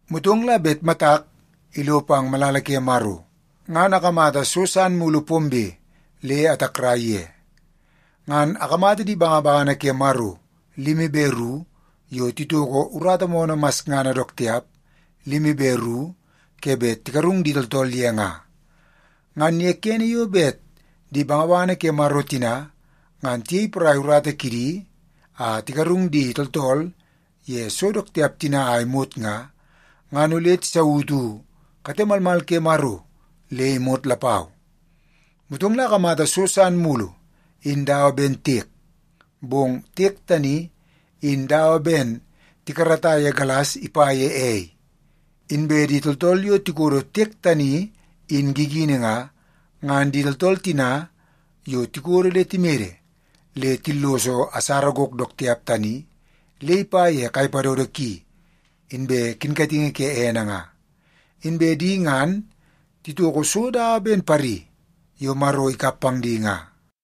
Motong la bet matak ilo pang malala ke Maro, ngan akamata so san mulu pombe le atakrai ye. Ngan akamata di bangabangana ke Maro limi be ru yo titoko urata moonoo masngana dook tiap limi be ru ke bet tigarung di tooltool ye nga. Ngan ye kene yo bet di bangabangana ke Maro tina ngan tiyei porai urata kidi a tigarung di tooltool ye so dook tiap tina a imot nga, ngan ole tisautu kate malmal ke Maro le imot lapau. Motong akamata so san mulu in dawa ben tiek, bong tiek tani in dawa ben tikarata ye galas ipa ye ei. Inbe di tooltool yo tikodo tiek tani in gigini nga, ngan di tooltool tina yo tikodo le timede le tilloso asara gok dook tiap tani le ipa ye kai padodo ki, inbe kinkatingi ke ene nga. Inbe di ngan titoko so dawa ben pari yo Maro ikap pang di nga,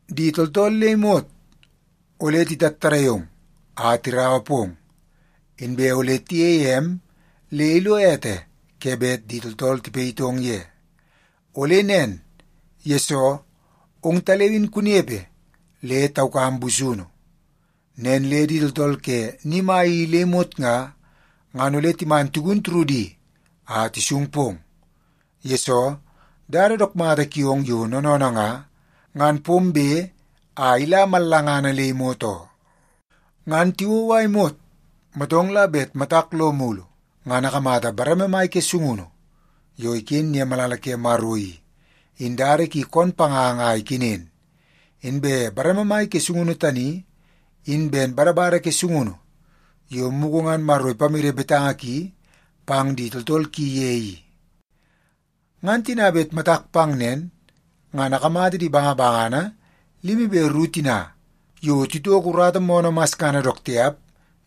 Di tooltool le imot ole titattadai ong a tiraua pong, inbe ole tiyeie em le ilo ete ke bet di tooltool tipayitong ye. Ole nen, yesoo ongtaleu in kunepe le taukam busunu. Nen le di tooltool ke ni mai i le imot nga, ngan ole timan tigun turudi a tisung pong. Yesoo, dada dook mata kiong yo noonoonoo nga, ngan pombe a ila mallangana le imot oo.” Ngan tiwou a imot, motong la bet matak lo mulu, ngan akamata bareme mai ke sungunu yo iken ye malala ke Maro i, in dada ki koon panganga a ikenen. Inbe bareme mai ke sungunu tani in ben badabada ke sungunu yo mugu ngan Maro ipamede betanga ki pang di tooltool ki ye i. Ngan tina bet matak pang nen, ngan akamata di bangabangana limi be ru tina yo titoko urata moonoo masngana dook tiap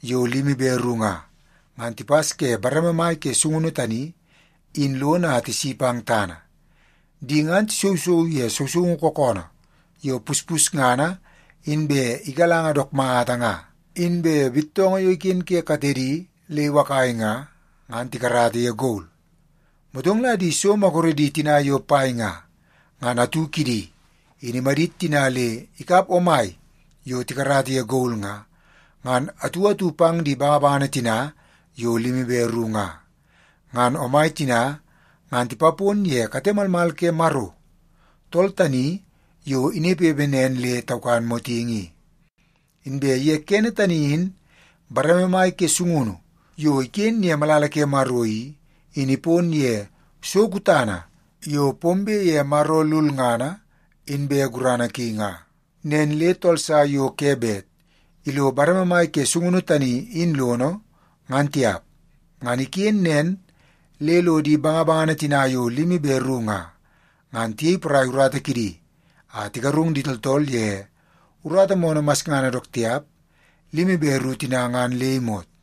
yo limi be ru nga, ngan tipas ke bareme mai ke sungunu tani in lono a tisi pang tana. Di ngan tisousou ye sousoungu kookoonoo yo puspusngana inbe igalanga dook mata nga. Inbe bittoongoo yo iken ke katedi le iwakai nga, ngan tikarata ye gol. Motong la di so maguredi tina yo pai nga, ngan atu kidi in imadit tina le ikap omai yo tikarata ye gol nga, ngan atu atu pang di bangabangana tina yo limi be ru nga. Ngan omai tina ngan tipapon ye kate malmal ke Maro, tool tani yo inepepe nen le taukan motingi i. Inbe ye kene tani in bareme mai ke sungunu yo iken ye malala ke Maro i, in ipon ye so kutana yo pombe ye Maro lulngana inbe gurana ki nga. Nen le tool sa yo ke bet ilo bareme mai ke sungunu tani in lono, ngan tiap. Ngan iken nen le lo di bangabangana tina yo limi be ru nga, ngan tiyei porai urata kidi a tigarung di tooltool ye urata moonoo masngana dook tiap limi be ru tina ngan le imot.